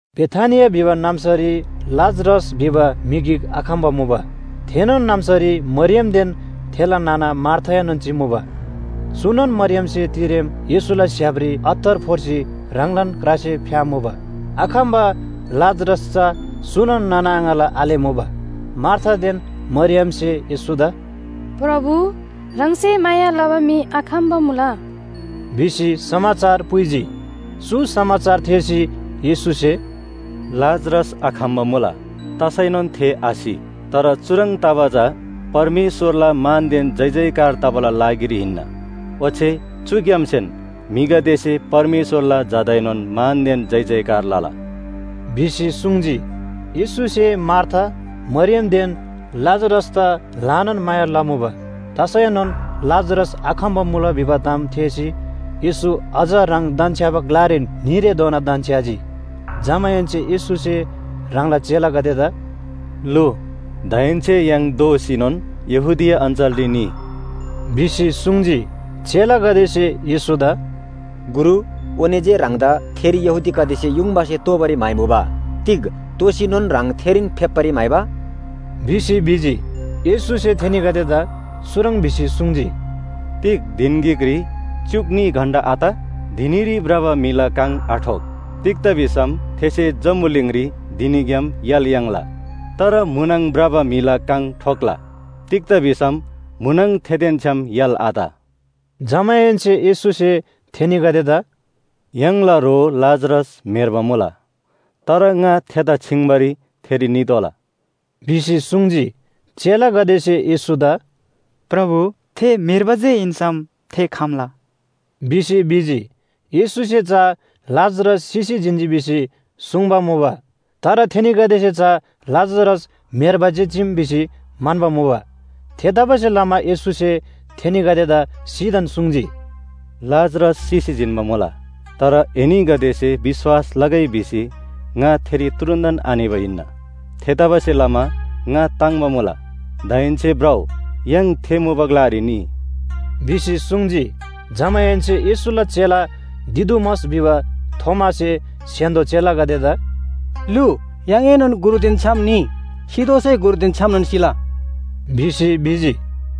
बेथानिया भिबा नाम्‍सारी लाजरस भिबा म्‍हि गिक आखम्‍बा मुबा। थेनोन नाम्‍सारी मरियमदेन थेला नाना मार्थाएनोन चिमुबा। चुनोन मरियमसे तिरेम येशूला स्‍य्‍हापरी अत्तर फोर्सी ह्राङलान क्रासे फ्‍यामुबा। आखम्‍बा लाजरस चा चुनोन नाना आङाला आले मुबा। मार्थादेन मरियमसे येशूदा “प्रभु, ह्राङसे माया लबा म्‍हि आखम्‍बा मुला” भिसी समाचार पुइजी। चु समाचार थेःसी येशूसे “लाजरस आखम्‍बा मुला, तसैनोन थे आसि। तर चुह्रङ् तबा चा परमेश्‍वरला मानदेन जयजयकार तबाला लागिरी हिन्‍ना, ओच्‍छे चुग्‍यामसेन म्‍हिगदेसे परमेश्‍वरला झादाएनोन मानदेन जयजयकार लला” भिसी सुङ्जी। येशूसे मार्था, मरियमदेन लाजरसदा ल्‍हानान माया लमुबा। तसैनोन लाजरस आखम्‍बा मुला भिबा ताम थेःसी येशू अझ ह्राङ धन्‍छ्‌याबा ग्‍लारीन न्‍हीरेधोना धन्‍छ्‌याजी। जमाहेन्‍से येशूसे ह्राङला चेलागदेदा “लु, दाहेन्‍से य्‍हाङ दोःसीनोन यहूदिया अञ्‍चलरी निइ” भिसी सुङ्जी। चेलागदेसे येशूदा “गुरु, ओने जे ह्राङदा थेरी यहूदीगदेसे युङबासे तोबारी म्‍हाइमुबा, तिग दोःसीनोन ह्राङ थेरीन फेप्‍बारी म्‍हाइबा?” भिसी भिजी। येशूसे थेनीगदेदा चुह्रङ् भिसी सुङ्जी, “तिग धिन गिकरी च्‍युक न्‍ही घण्‍टा आत? धिनीरी भ्रबा म्‍हिला काङ आठोक। तिग्‍दा भिसम थेसे जम्‍बुलिङरी धिनीग्‍याम य्‍हाल याङ्ला। तर म्‍हुनङ भ्रबा म्‍हिला काङ ठोक्‍ला। तिग्‍दा भिसम म्‍हुनङ थेदेन छ्‌याम य्‍हाल आत।” जमाहेन्‍से येशूसे थेनीगदेदा “य्‍हाङला ह्रो लाजरस म्‍हेर्बा मुला। तर ङा थेदा छिङ्बारी थेरी नितोःला” भिसी सुङ्जी। चेलागदेसे येशूदा “प्रभु, थे म्‍हेर्बा जे हिन्‍सम थे खम्‍ला” भिसी भिजी। येशूसे सुङ्बा चा लाजरस सिसी जिन्‍जी भिसी सुङ्बा, तर थेनीगदेसे चा लाजरस म्‍हेर्बा जे चीम भिसी म्‍हन्‍बा मुबा। थेतबासेलमा येशूसे थेनीगदेदा सिधान सुङ्जी, “लाजरस सिसी जिन्‍बा मुला। तर एनीगदेसे विश्‍वास लगै भिसी ङा थेरी तुरुन्‍तन आनिबा हिन्‍ना। थेतबासेलमा ङा ताङ्‍बा मुला। दाहेन्‍से भ्रउ, य्‍हाङ थे मुबा ग्‍लारी निइ” भिसी सुङ्जी। जमाहेन्‍से येशूला चेला दिदुमस भिबा थोमासे स्‍य्‍हान्‍दो चेलागदेदा “लु, य्‍हाङएनोन गुरुदेन छ्‌याम निइ, सितोःसै गुरुदेन छ्‌यामनोन सिला” भिसी भिजी।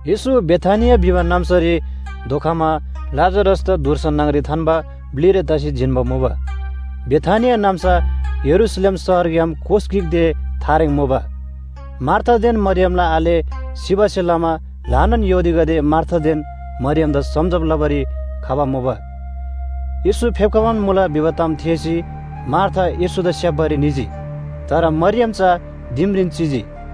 येशू बेथानिया भिबा नाम्‍सारी धोखमा लाजरसदा धुर्सा न्‍हङ‍री थान्‍बा ब्‍लिरे तसी जिन्‍बा मुबा। बेथानिया नाम्‍सा यरूशलेम शहरग्‍याम कोस गिक ते थारेङ मुबा। मार्थादेन मरियमला आले सिबासे लमा ल्‍हानान यहूदीगदे मार्थादेन मरियमदा सम्‍झब लबारी खबा मुबा। येशू फेप्‍खबान मुला भिबा ताम थेःसी मार्था येशूदा स्‍याप्‍बारी निजी। तर मरियम चा दिमरीन चिजी।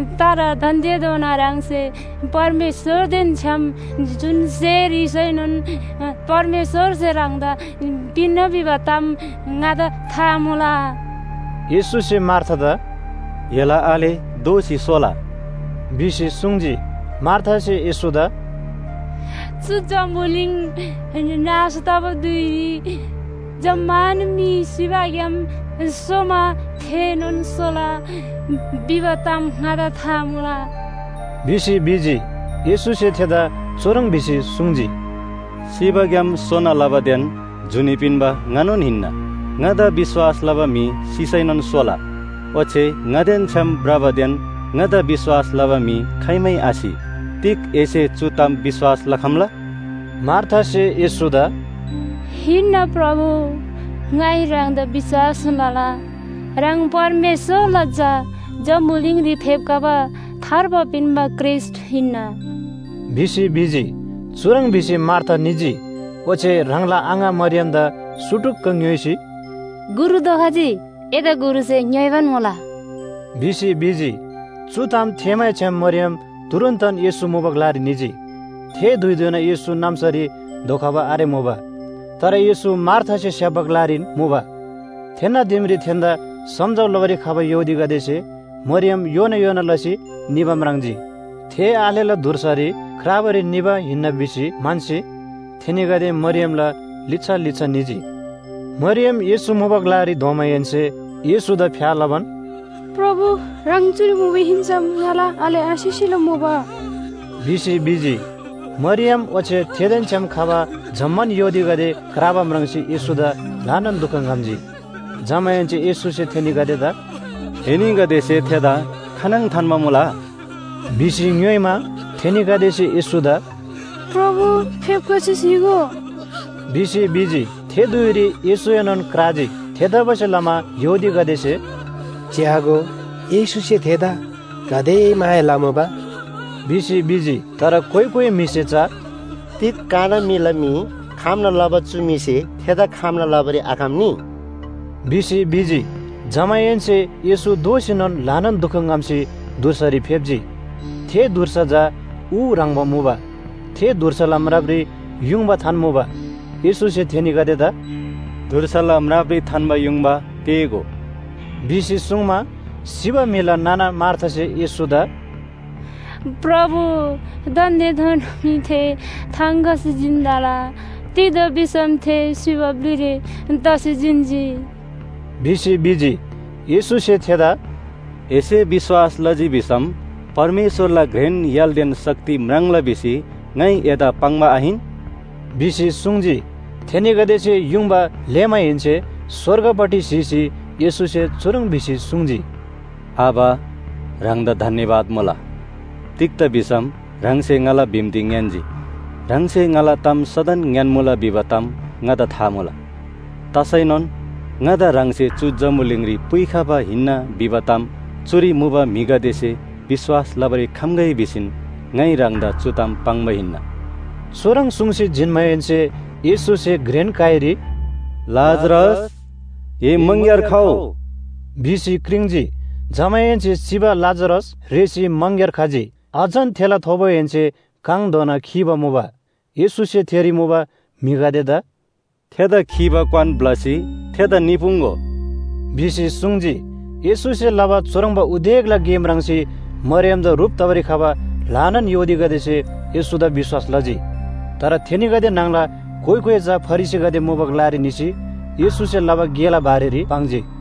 तर दान्‍देनोन ह्राङसे परमेश्‍वरदेन छ्‌याम जुन स्‍हे ह्रीसैनोन परमेश्‍वरसे ह्राङदा पिन्‍ना भिबा ताम ङादा था मुला।” येशूसे मार्थादा “एला आले दोःसी सोला” भिसी सुङ्जी। मार्थासे येशूदा “चु जम्‍बुलिङ नाश तबा धुइरी जम्‍मान म्‍हि सिबाग्‍याम सोमा थेएनोन सोला भिबा ताम ङादा था मुला” भिसी भिजी। येशूसे थेदा चुह्रङ् भिसी सुङ्जी, “सिबाग्‍याम सोना लबादेन जुनी पिन्‍बा ङानोन हिन्‍ना। ङादा विश्‍वास लबा म्‍हि सिसैनोन सोला। ओच्‍छे ङादेन छ्‌याम भ्रबादेन ङादा विश्‍वास लबा म्‍हि खाइमै आसि। तिग एसे चु ताम विश्‍वास लखम्‍ला?” भिसी सुङ्जी। मार्थासे येशूदा “हिन्‍ना प्रभु, ङाइ ह्राङदा विश्‍वास लला, ह्राङ परमेश्‍वरला झा जम्‍बुलिङरी फेप्‍खबा थार्बा पिन्‍बा ख्रीष्‍ट हिन्‍ना” भिसी भिजी। चुह्रङ् भिसी मार्था निजी, ओच्‍छे ह्राङला आङा मरियमदा सुटुक्‍क ङ्‌योइसी, “गुरु धोखजी, एदा गुरुसे ङ्‍योइबान मुला” भिसी भिजी। चु ताम थेःमैछ्‌याम मरियम तुरुन्‍तन येशू मुबा ग्‍लारी निजी। थे धुइधोना येशू नाम्‍सारी धोखबा आरेमुबा। तर येशू मार्थासे स्‍याप्‍बा ग्‍लारीन मुबा। थेन्‍ना दिमरी थेन्‍दा सम्‍झब लबारी खबा यहूदीगदेसे मरियम योना योना लसी निबा म्राङ्जी। थे आलेला धुर्सारी क्राबारी निबा हिन्‍ना भिसी म्‍हन्‍सी थेनीगदे मरियमला लिच्‍छा लिच्‍छा निजी। मरियम येशू मुबा ग्‍लारी धोमाहेन्‍से येशूदा फ्‍या लबान, “प्रभु, ह्राङ चुरी मुबा हिन्‍सम ङाला आले आसिसेला मुबा” भिसी भिजी। मरियम ओच्‍छे थेदेन छ्‌याम खबा जम्‍मान यहूदीगदे क्राबा म्राङ्सी येशूदा ल्‍हानान दुख ङ्‌हम्‍जी। जमाहेन्‍से येशूसे थेनीगदेदा “एनीगदेसे थेदा खानङ थान्‍बा मुला?” भिसी ङ्‌योइमा, थेनीगदेसे येशूदा “प्रभु, फेप्‍खसी स्‍हीगो” भिसी भिजी। थे धुइरी येशूएनोन क्राजी। थेतबासेलमा यहूदीगदेसे “च्‍यागो, येशूसे थेदा गाते माया लमुबा” भिसी भिजी। तर कोइ कोइ म्‍हिसे चा “तिग काना म्‍हिला मी खम्‍ना लबा चु म्‍हिसे थेदा खम्‍ना लबारी आखम्‍नी?” भिसी भिजी। जमाहेन्‍से येशू दोःसीनोन ल्‍हानान दुख ङ्‍हम्‍सी धुर्सारी फेप्‍जी। थे धुर्सा चा ऊ ह्रङ्‌बा मुबा। थे धुर्साला म्रापरी युङबा थान्‍मुबा। येशूसे थेनीगदेदा “धुर्साला म्रापरी थान्‍बा युङबा तेः‍गो” भिसी सुङ्मा, सिबा म्‍हिला नाना मार्थासे येशूदा “प्रभु दान्‍देधोना मी थे थाङ खसी जिन्तला। तिग्‍दा भिसम थे सिबा ब्‍लिरे तसी जिन्‍जी” भिसी भिजी। येशूसे थेदा “एसे विश्‍वास लजी भिसम परमेश्‍वरला घ्रेन य्‍हालदेन शक्ति म्राङ्ला भिसी ङाइ एदा पाङ्बा आहिन?” भिसी सुङ्जी। थेनीगदेसे युङबा लेःमाहेन्‍से स्‍वर्गपट्टि स्‍हीसी येशूसे चुह्रङ् भिसी सुङ्जी, “आबा, ह्राङदा धन्‍यवाद मुला। तिग्‍दा भिसम ह्राङसे ङाला बिन्‍ती ङ्‌यान्‍जी। ह्राङसे ङाला ताम सदन ङ्‍यान्‍मुला भिबा ताम ङादा था मुला। तसैनोन ङादा ह्राङसे चु जम्‍बुलिङरी पुइखबा हिन्‍ना भिबा ताम चुरी मुबा म्‍हिगदेसे विश्‍वास लबारी खम्‍गै भिसीन ङाइ ह्राङदा चु ताम पाङ्बा हिन्‍ना।” चुह्रङ् सुङ्सी जिन्‍माहेन्‍से येशूसे घ्रेन काइरी “लाजरस, ए मङग्‍यार खउ” भिसी क्रिङ्‌जी। जमाहेन्‍से सिबा लाजरस रेःसी मङग्‍यार खजी। अझन थेला थोबोहेन्‍से काङधोना खीबा मुबा। येशूसे थेरी मुबा म्‍हिगदेदा “थेदा खीबा क्‍वान ब्‍लसी थेदा निपुङ्‍गो” भिसी सुङ्जी। येशूसे लबा चुह्रङ्बा उदेकला गे म्राङ्सी मरियमदा ह्रुप तबारी खबा ल्‍हानान यहूदीगदेसे येशूदा विश्‍वास लजी। तर थेनीगदे न्‍हङला कोइ कोइ चा फरिसीगदे मुबा ग्‍लारी निसी येशूसे लबा गेला बारेरी पाङ्जी।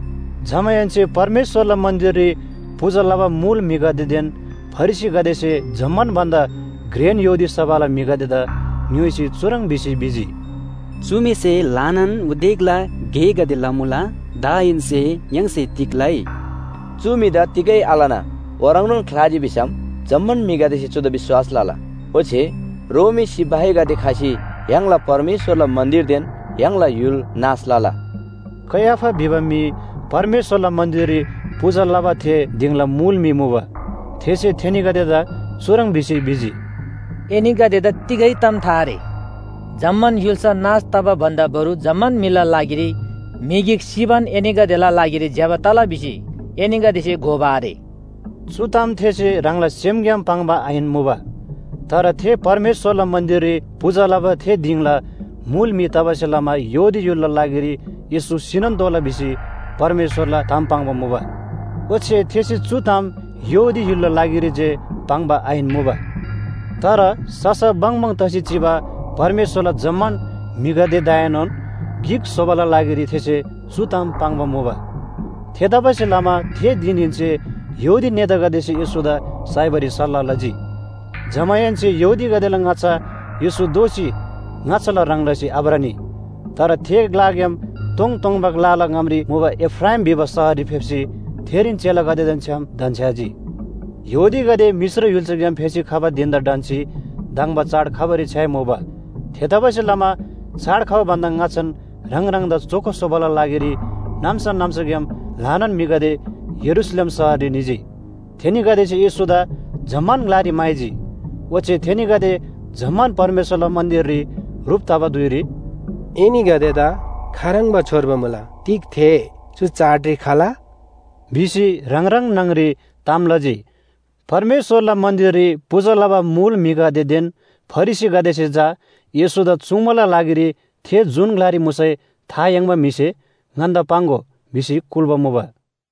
जमाहेन्‍से परमेश्‍वरला मन्‍दिररी पूजा लबा मुल म्‍हिगदेदेन फरिसीगदेसे जम्‍मान भन्‍दा घ्रेन यहूदी सभाला म्‍हिगदेदा ङ्‌योइसी चुह्रङ् भिसी भिजी, “चु म्‍हिसे ल्‍हानान उदेकला गेगदे लमुला। दाहेन्‍से य्‍हाङसे तिग लइ? चु म्‍हिदा तिगै आलना ओह्रङ्नोन ख्‍लाजी भिसम जम्‍मान म्‍हिगदेसे चुदा विश्‍वास लला। ओच्‍छे रोमी सिपाहीगदे खसी य्‍हाङला परमेश्‍वरला मन्‍दिरदेन य्‍हाङला य्‍हुल नाश लला।” कैयाफा भिबा म्‍हि परमेश्‍वरला मन्‍दिररी पूजा लबा थे दिङला मुल म्‍हि मुबा। थेसे थेनीगदेदा चुह्रङ् भिसी भिजी, “एनीगदेदा तिगै ताम था आरे। जम्‍मान य्‍हुल्‍सा नाश तबा भन्‍दा बरु जम्‍मान म्‍हिला लागिरी म्‍हि गिक सिबान एनीगदेला लागिरी ज्‍यबा तला भिसी एनीगदेसे घोबा आरे।” चु ताम थेसे ह्राङला सेमग्‍याम पाङ्बा आहिन मुबा। तर थे परमेश्‍वरला मन्‍दिररी पूजा लबा थे दिङला मुल म्‍हि तबासे लमा यहूदी य्‍हुलला लागिरी येशू सिनोन तोःला भिसी परमेश्‍वरला ताम पाङ्बा मुबा। ओच्‍छे थेसे चु ताम यहूदी य्‍हुलला लागिरी जे पाङ्बा आहिन मुबा। तर ससा बङबङ तसी चिबा परमेश्‍वरला जम्‍मान म्‍हिगदेदाएनोन गिक स्‍होबाला लागिरी थेसे चु ताम पाङ्बा मुबा। थेतबासेलमा थे धिनहेन्‍से यहूदी नेतागदेसे येशूदा साइबारी सल्‍लाह लजी। जमाहेन्‍से यहूदीगदेला ङाच्‍छा येशू दोःसी ङाच्‍छाला ह्रङ् लसी आभ्रनी। तर थे ग्‍लाग्‍याम तोङतोङबा ग्‍लाला ङामरी मुबा एफ्राइम भिबा शहररी फेप्‍सी थेरीन चेलागदेदेन छ्‌याम धन्‍छ्‌याजी। यहूदीगदे मिश्र य्‍हुल्‍साग्‍याम फेसी खबा धिन‍दा ढन्‍सी धङ्बा चाड खबारी छ्‌याइमुबा। थेतबासेलमा चाड खबा भन्‍दा ङाच्‍छान ह्राङ ह्राङदा चोखो स्‍होबाला लागिरी नाम्‍सा नाम्‍साग्‍याम ल्‍हानान म्‍हिगदे यरूशलेम शहररी निजी। थेनीगदेसे येशूदा जम्‍मान ग्‍लारी म्‍हाइजी, ओच्‍छे थेनीगदे जम्‍मान परमेश्‍वरला मन्‍दिररी ह्रुप तबा धुइरी “एनीगदेदा खाह्रङ्बा छोर्बा मुला, तिग थे चु चाडरी खला?” भिसी ह्राङ ह्राङ न्‍हङ‍री ताम लजी। परमेश्‍वरला मन्‍दिररी पूजा लबा मुल म्‍हिगदेदेन फरिसीगदेसे चा येशूदा चुङ्बाला लागिरी थे जुन ग्‍लारी मुसै था याङ्बा म्‍हिसे “ङन्‍दा पाङ्‍गो” भिसी कुल्‍बा मुबा।